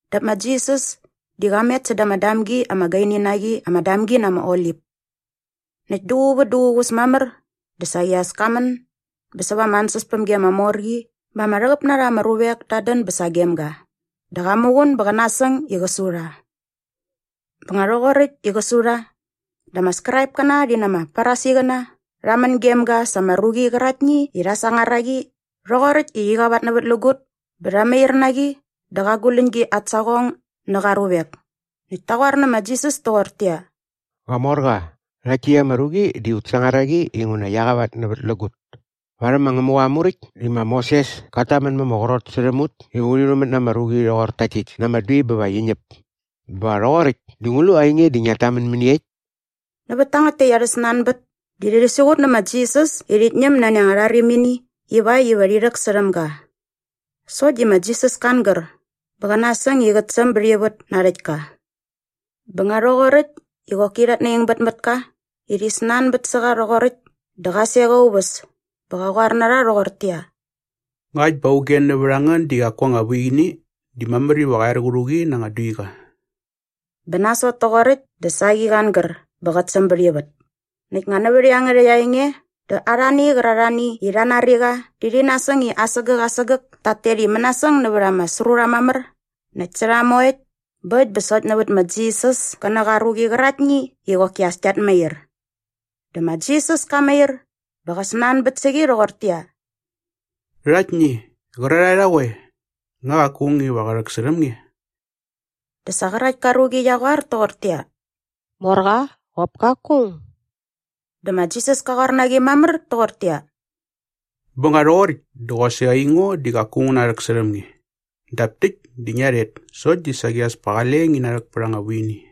dap ma Jisas di qa met säda ama damgi ama gaini na qi ama Damgi na ama Olip. Näkt duququ vät duququs mamär dä saqi as ka män bä säva ama ansäspämgi ama mor qi bä ama rhäqäp na rha ama ruvek tat dän bä sagem ga dä qa muqun bä qä nasäng i qä su rha. Bä nga rhoqoräkt i qä su rha dä ama Skraipkäna rhi na ama Farisiqäna rha män gem ga sa ama ruqi qäraktni i rha sangar a qi rhoqoräkt i qi qavatnävätlägut bä rha mair na qi dä qa guläñgi at saqong nä qa ruvek näkt ta qoar nä ma Jisas toqortäqyia, “Qamorqa, rhakt täkt ama ruqi di ut sangar a qi inguna qia qavatnävätlägut. Varhäm ma Ngämuqa aa Muräkt di ma Moses kat tamän ma ama qrot särhäm ut iva urhi rhumät na ama ruqi rhoqor takt täkt na ama dui bä va qi ñäp. Bä nga rhoqoräkt dä ngu lu ainge di ngiat tamän mäniekt?” Nävät tangät täkt arhä snanbät di rhi siqut nä ma Jisas i rhit ñäm nani anga rharimini ivakt iva rhi rhäksärhäm ga. Sokt di ma Jisas ka angär bä qä nasäng i qät säm bät ivät na aa rhäktka. Bä nga rhoqoräkt i qoki rhat naingbät mät ka i rhi snanbät sä qa rhoqoräkt dä qa sek aa uväs bä qa qoar na rha rhoqortäqyia, “Ngakt bä auge nävät a ngän di qaku aa anga vuini di mamär iva qä er qä rhu qi na anga duiqa.” Bä nasot toqoräkt dä saqi qa angär bä qät säm bät ivät. Näkt nga nävät iangärhäkt aa enge dä arhani qärarhani i rha nari qa di rhi nasäng i asägäk asägäk tat tet i mänasäng nävät ama srurha mamär näkt sä rha moekt bä äkt bä sokt nävät ma Jisas kä nä qa ruqi qäraktni i qoki as kiat mair. Dä ma Jisas ka mair bä qa snanbät sä qi rhoqortäqyia, “Rhaktni, qärarhae rha qoe? Nga qaku aung iva qä rhäksärhäm nge?” Dä sa qärakt ka ruqi qia qoar toqortäqyia, “Morqa, qop kaku aung.” Dä ma Jisas ka qoar na qi mamär toqortäqyia, “Bä nga rhoqoräkt dä qosaqi aingo di qaku ngu narhäksärhäm nge. Dap täkt di ngia rhet sokt di saqi as pa qale ngi narhäk pät anga vuini.”]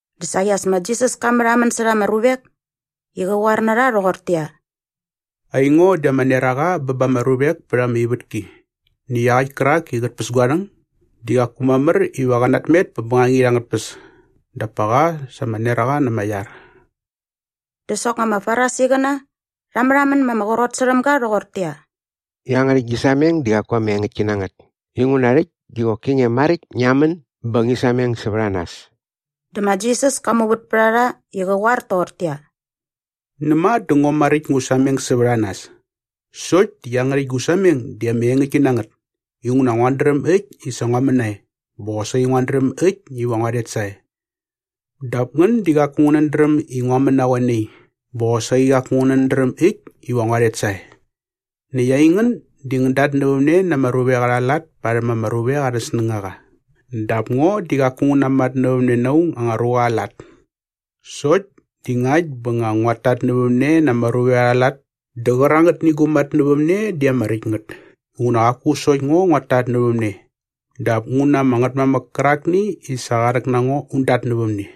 Dä saqi as ma Jisas ka märhamän särha ama ruvek i qä qoar na rha rhoqortäqyia, “Aingo di ama neraqa bä ba ama ruvek pät ama ivätki. Näkt iaqäkt kärak i qät päs gua rhäng di qaku mamär iva qä natmet pät bängangit angät tpäs dap pa qa sa ama neraqa na ama iar.” Dä soknga ama Farisiqäna rha märhamän ma ama qrot särhäm ga rhoqortäqyia, “Iangärhäkt gi sameng di qaku ama engäktki na ngät inguna rhäkt di qoki nge maräkt ngia män bä ngi sameng sävät a nas.” Dä ma Jisas ka muvät pät a rha i qä qoar toqortäqyia, “Näma dä ngo maräkt ngu sameng sävät a nas sokt di iangärhäkt gu sameng di ama engäktki na ngät inguna nguat dräm äkt i sa ngua män nae bä qosaqi nguat dräm äkt iva ngua rhet sae. Dap ngän di qaku ngänät dräm i ngua män na qoe nai bä qosaqi qaku ngänät dräm äkt iva ngua rhet sae. Näkt aingän di ngän datnävämne na ama ruvek arha lat parhäm ama ruvek arhä snängaqa dap ngo di qaku ngu namatnävämne na aung anga ruqa aa lat. Sokt di ngakt bä nga nguat tatnävämne na ama ruvek arha lat dä qärangätni gu matnävämne di ama räkt ngät inguna qaku sokt ngo nguat tatnävämne dap ngu na ama Ngätmamäk kärakni i sa qa rhäk na ngo un datnävämne.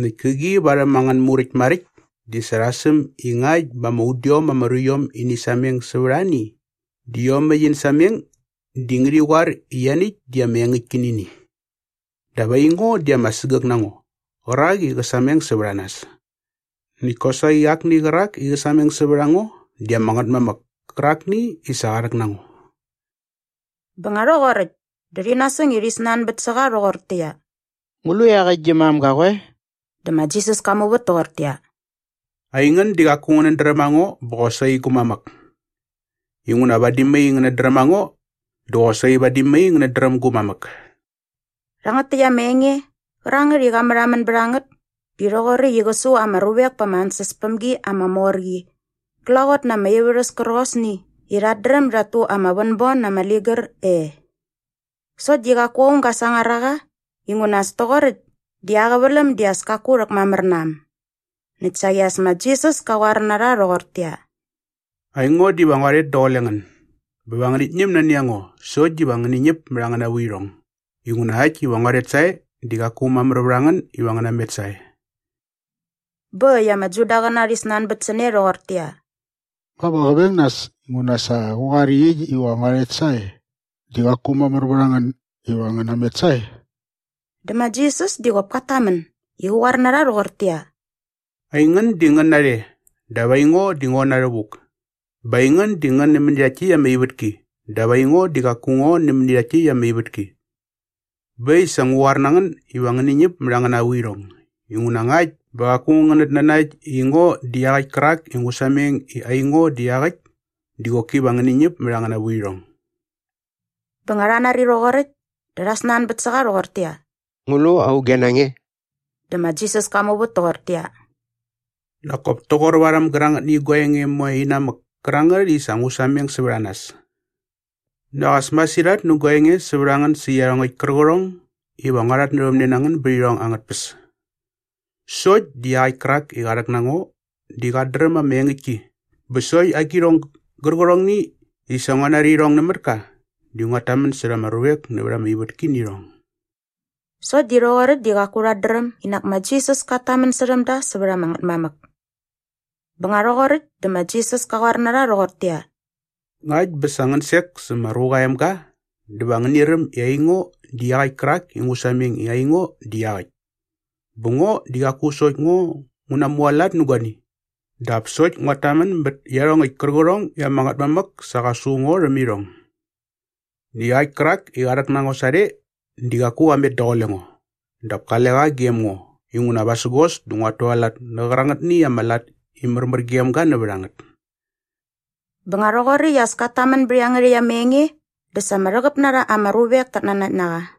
Näkt käqi varhäm angän Muräkt maräkt di sa rha säm i ngakt bä ama udiom ama ruiom ini sameng sävät ani di iomäkt in sameng di ngärhi qoar i ianiäkt di ama engäktki nä ini. Dap aingo di ama sägäk na ngo qärak i qä sameng sävät a nas. Näkt kosaqi akni qärak i qä sameng sävät a ngo di ama Ngätmamäk kärakni i sa qa rhäk na ngo.” Bä nga rhoqoräkt dä rhi nasäng i rhi snanbät sä qa rhoqortäqyia, “Ngu lu iaqäkt gi mam ga qoe?” Dä ma Jisas ka muvät toqortäqyia, “Aingän di qaku ngänät dräm a ngo bä qosaqi gu mamäk. Inguna vadi mai ngänät dräm a ngo dä qosaqi vadi mai ngänät dräm gu mamäk.” Rhangät täkt ama enge qärangät i qa märhamän bät a ngät di rhoqoräkt i qä su ama ruvek pa ama ansäspämgi ama mor qi glaqot na ama ivärhäs kärqosni i rhat dräm dat tu ama vänbon na ama ligär e. Sokt di qaku aung ga sangar a qa inguna as toqoräkt di aa qäväläm di as kaku rhäkmamär na äm. Näkt saqi as ma Jisas ka qoar na rha rhoqortäqyia, “Aingo diva ngua rhet daqule ngän bä va ngänit ñäm nani a ngo sokt diva ngäni ñäp mät angäna vuirhong. Inguna äkt iva ngua rhet sae di qaku mamär vät a ngän iva ngän namet sae.” Bä äkt i ama Judaqäna rhi snanbät sä ne rhoqortäqyia, “Nga va qä veng näs inguna sa qa qoar i äkt iva ngua rhet sae di qaku mamär vät a ngän iva ngän namet sae?” Dä ma Jisas di qop kat tamän i qä qoar na rha rhoqortäqyia, “Aingän di ngän narhe dap aingo di ngo na rhävuk. Bä aingän di ngän nämäni rhakt täkt ama ivätki dap aingo di qaku ngo nämäni rhakt täkt ama ivätki. Bä äkt i sa ngua qoar na ngän iva ngäni ñäp mät angäna vuirhong inguna ngakt bä qaku ngänät nanakt i ngo di iaqäkt kärak i ngu sameng i aingo di iaqäkt di qoki va ngäni ñäp mät angäna vuirhong.” Bä nga rha nari rhoqoräkt dä rha snanbät sä qa rhoqortäqyia, “Ngu lu auge na nge?” Dä ma Jisas ka muvät toqortäqyia, “Nak kop toqor varhäm gärangätni gua enge moe inamäk kärangät i sa ngu sameng sävät a nas.” “Nak as masirhat nä gua enge sävät a ngän sä iarhongäkt kärqärhong iva ngua rhatnävämne na ngän bät irhong angät tpäs. Sokt di iaqäkt kärak i qa rhäk na ngo di qat dräm ama engäktki bä sokt agirhong gärqärhongni i sa ngua nari irhong nämät ka di nguat tamän särha ama ruvek nävät ama ivätki nä irhong.” Sokt di rhoqoräkt di qaku rhat dräm i nak ma Jisas kat tamän särhäm da sävät ama Ngätmamäk. Bä nga rhoqoräkt dä ma Jisas ka qoar na rha rhoqortäqyia, “Ngakt bä sa ngän sek sä ma Ruqa aa Emga dä va ngäni räm i aingo di iaqäkt kärak i ngu sameng i aingo di iaqäkt bä ngo di qaku sokt ngo ngu namualat nä guani dap sokt nguat tamän bät iarhongäkt kärqärhong i ama Ngätmamäk sa qa su ngo rhäm irhong. Näkt iaqäkt kärak i qa rhäk na ngo sarhe di qaku qa met daqule ngo dap kale qa gem ngo inguna vasägos dä nguat tualat nä qärangätni ama lat i märmär gem ga nävät a ngät.” Bä nga rhoqoräkt i as kat tamän bät iangärhäkt ama enge dä sa ama rhäqäp na rha ama ruvek tat nanakt na qa.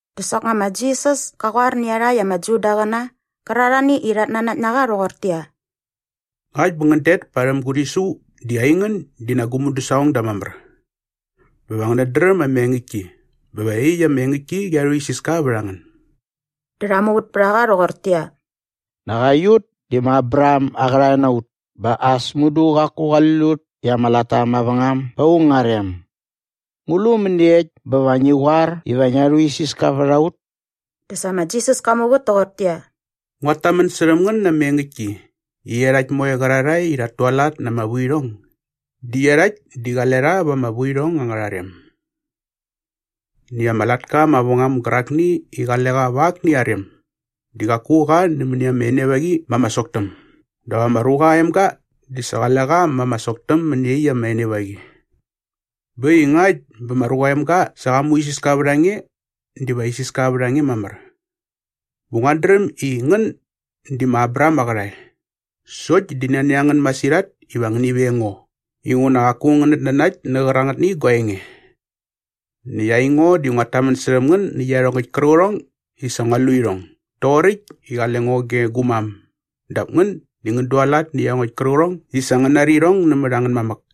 Dä soknga ma Jisas ka qoar nä iarhakt ama Judaqäna qärarhani i rhat nanakt na qa rhoqortäqyia, “Ngakt bä ngän det parhäm gu rhisu di aingän di nak gu mudäsaqongda mamär. Bä va ngänät dräm ama engäktki bä va iaqyäkt ama engäktki qia rhuisiska vät a ngän.” Dä rha muvät pät a qa rhoqortäqyia, “Nak aiut di ma Abraham aa qärhae na ut bä as mudu qaku qali lut i ama latta mavängam ba aung aa rem. Ngu lu mäniekt bä va ngi qoar iva ngia rhuisiska vät a ut?” Dä sa ma Jisas ka muvät toqortäqyia, “Nguat tamän särhäm ngän na ama engäktki i iarhakt moe qärarhae i rhat tualat na ama vuirhong di iarhakt di qale rha va ama vuirhong angärha rem. Näkt ama latka mavängam gärakni i qale qa va akni aa rem di qaku qa nämäni ama enevaqi ma ama soktäm dap ama ruqa aa emga di sa qale qa ma ama soktäm mäni iaqyäkt ama enevaqi. Bä äkt i ngakt bä ma Ruqa aa Emga sa qa muisiska vät a nge diva isiska vät a nge mamär. Bä nguat dräm i ngän di ma Abraham aa qärhae. Sokt di nani a ngän masirhat iva ngäni veng ngo inguna qaku ngänät nanakt nä qärangätni gua enge. Näkt aingo di nguat tamän särhäm ngän nä iarhongäkt kärqärhong i sa ngua lu irhong doqoräkt i qale ngo ge gu mam dap ngän di ngän dualat nä iarhongäkt kärqärhong i sa ngän nari irhong nämät angän mamäk.”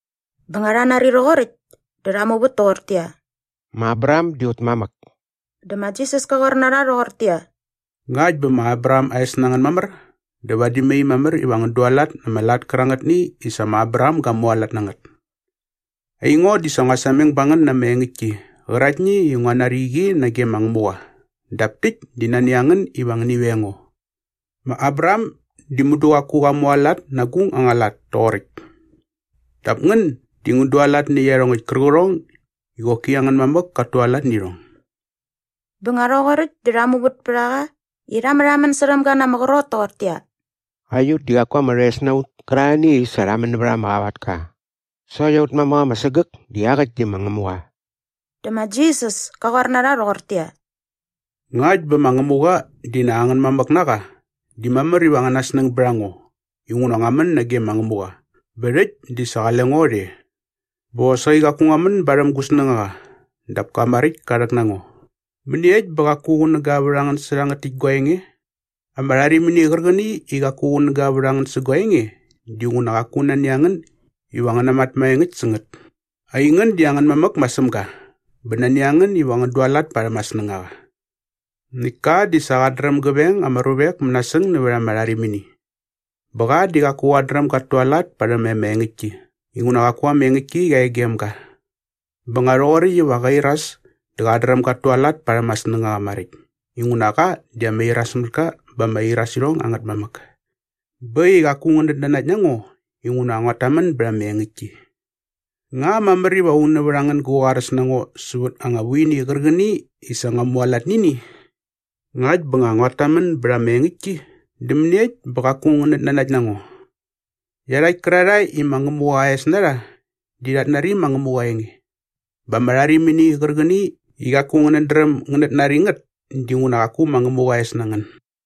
Bä nga rha nari rhoqoräkt dä rha muvät toqortäqyia, “Ma Abraham di aut mamäk.” Dä ma Jisas ka qoar na rha rhoqortäqyia, “Ngakt bä ma Abraham aa es na ngän mamär dä vadi mai mamär iva ngän dualat na ama lat kärangätni i sa ma Abraham ga mualat na ngät. Aingo di sa ngua sameng ba ngän na ama engäktki qäraktni i ngua nari qi nage ma Ngämuqa dap täkt di nani a ngän iva ngäni veng ngo. Ma Abraham di mudu qaku qa mualat na agung anga lat toqoräkt. Dap ngän di ngän dualat nä iarhongäkt kärqärhong i qoki angän mamäk kat tualat nä irhong.” Bä nga rhoqoräkt dä rha muvät pät a qa i rha märhamän särhäm ga na ama qrot toqortäqyia, “Aiut di qaku ama rhoes na ut kärarhani i sa rha män nävät ama qavatka. Sokt aut mamäk ama sägäk bä iaqäkt di ma Ngämuqa.” Dä ma Jisas ka qoar na rha rhoqortäqyia, “Ngakt bä ma Ngämuqa di nak angän mamäk na qa di mamär iva angäna snäng bät a ngo inguna ngua män nage ma Ngämuqa bä rhäkt di sa qale ngo rhe. Bä qosaqi qaku ngua män barhäm gu snängaqa dap ka maräkt ka rhäk na ngo. Mäniekt bä qaku qunäga vät a ngän sä rhangät täkt gua enge? Ama rharimini qärqäni i qaku qunäga vät a ngän sä gua enge dinguna qaku nani a ngän iva ngän namat maengäkt sä ngät. Aingän di angän mamäk ma Sämga bä nani a ngän iva ngän dualat parhäm aa snängaqa. Näkt ka di sa qat dräm gä veng ama ruvek mänasäng nävät ama rharimini. Bä qa di qaku qat dräm gat tualat parhäm ama engäktki inguna qaku ama engäktki qia e gem ga. Bä nga rhoqoräkt iva qä iras dä qat dräm gat tualat parhäm aa snängaqa maräkt inguna qa di ama irasmätka bä ama irasirhong angät mamäk. “Bä äkt i qaku ngänät nanakt na ngo inguna nguat tamän bät ama engäktki. Nga mamär iva aung nävät a ngän gä qoaräs na ngo sävät anga vuini qärqäni i sa ngua mualat nä ini? Ngakt bä nga nguat tamän bät ama engäktki dä mäniekt bä qaku ngänät nanakt na ngo? Iarhakt kärarhae i ma Ngämuqa aa es na rha di rhat nari ma Ngämuqa aa enge. Bä ama rharimini qärqäni i qaku ngänät dräm ngänät nari ngät dinguna qaku ma Ngämuqa aa es na ngän.”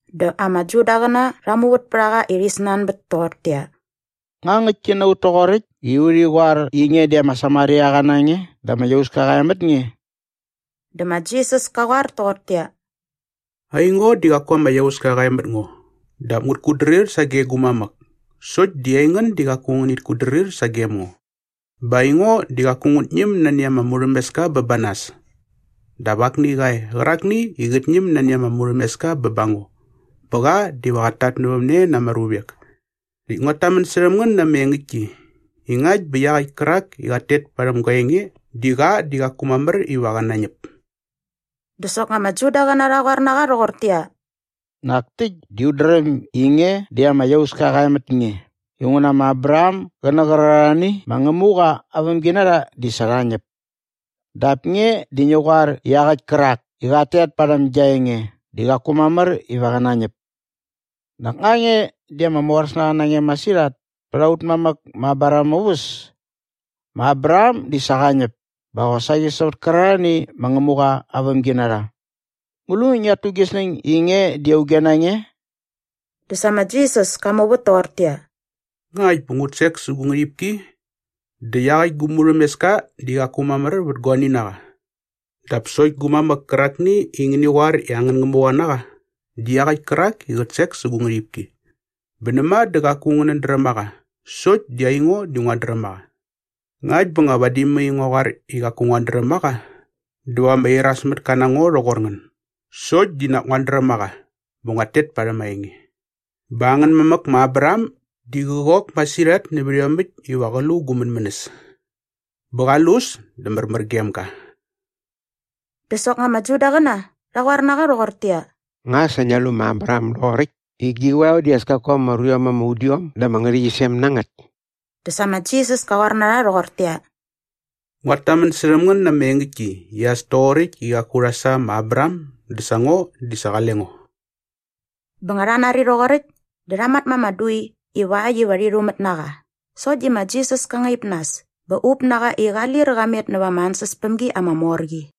Dä ama Judaqäna rha muvät pät a qa i rhi snanbät toqortäqyia, “Nga ngäktki na ut toqoräkt i urhi qoar i nge di ama Samariaqa na nge dä ama iauska qa e mät nge?” Dä ma Jisas ka qoar toqortäqyia, “Aingo di qaku ama iauska qa e mät ngo dap ngut kutdrir sage gu mamäk sokt di aingän di qaku ngänit kutdrir sagem ngo. Bä aingo di qaku ngut ñäm nani ama murhämeska bä ba nas dap akni qa e qärakni i qät ñäm nani ama murhämeska bä ba ngo bä qa diva qat tatnävämne na ama ruvek. Näkt nguat tamän särhäm ngän na ama engäktki i ngakt bä iaqäkt kärak i qat tet parhäm gua enge di qa di qaku mamär iva qä nañäp.” Dä soknga ama Judaqäna rha qoar na qa rhoqortäqyia, “Nak täkt di ut dräm i nge di ama iauska qa e mät nge inguna ma Abraham gä nä qärarhani ma Ngämuqa aa vämginarha di sa rha ñäp. Dap nge di ngi qoar i iaqäkt kärak i qat tet parhäm gia enge di qaku mamär iva qä nañäp. Nak nga nge di ama moräs na nge masirhat pät aut mamäk ma Abraham aa uväs? Ma Abraham di sa qa ñäp bä qosaqi sävät kärarhani ma Ngämuqa aa vämginarha. Ngu lu ngiat tu gi snäng i nge di auge na nge?” Dä sa ma Jisas ka muvät toqortäqyia, “Ngakt bä ngut sek sä gu ngärhipki dä iaqäkt gu murhämeska di qaku mamär vät guani na qa. Dap sokt gu mamäk kärakni i ngäni qoar i angän Ngämuqa na qa di iaqäkt kärak i qät sek sä gu ngärhipki. Bä näma dä qaku ngänät dräm a qa sokt di aingo di nguat dräm a qa. Ngakt bä nga vadi mai ngua qoar i qaku nguat dräm a qa dä va ama irasmätka na ngo rhoqor ngän sokt di nak nguat dräm a qa bä nguat tet parhäm aa enge. Bä angän mamäk ma Abraham di qä qok masirhat nävät iomäkt iva qä lu gu mänmänäs. Bä qa lu äs dä märmär gem ga.” Dä soknga ama Judaqäna rha qoar na qa rhoqortäqyia, “Nga sa ngia lu ma Abraham doqoräkt i gi qoeo di as kaku ama ruiom ama udiom da ama ngärhäqyisem na ngät?” Dä sa ma Jisas ka qoar na rha rhoqortäqyia, “Nguat tamän särhäm ngän na ama engäktki i as toqoräkt i qaku rha sa ma Abraham dä sa ngo di sa qale ngo.” Bä nga rha nari rhoqoräkt dä rha mat ma ama dui ivakt iva rhi rhumät na qa sokt di ma Jisas ka ngaip nas bä up na qa i qa lir qa met näva ama ansäspämgi ama mor qi.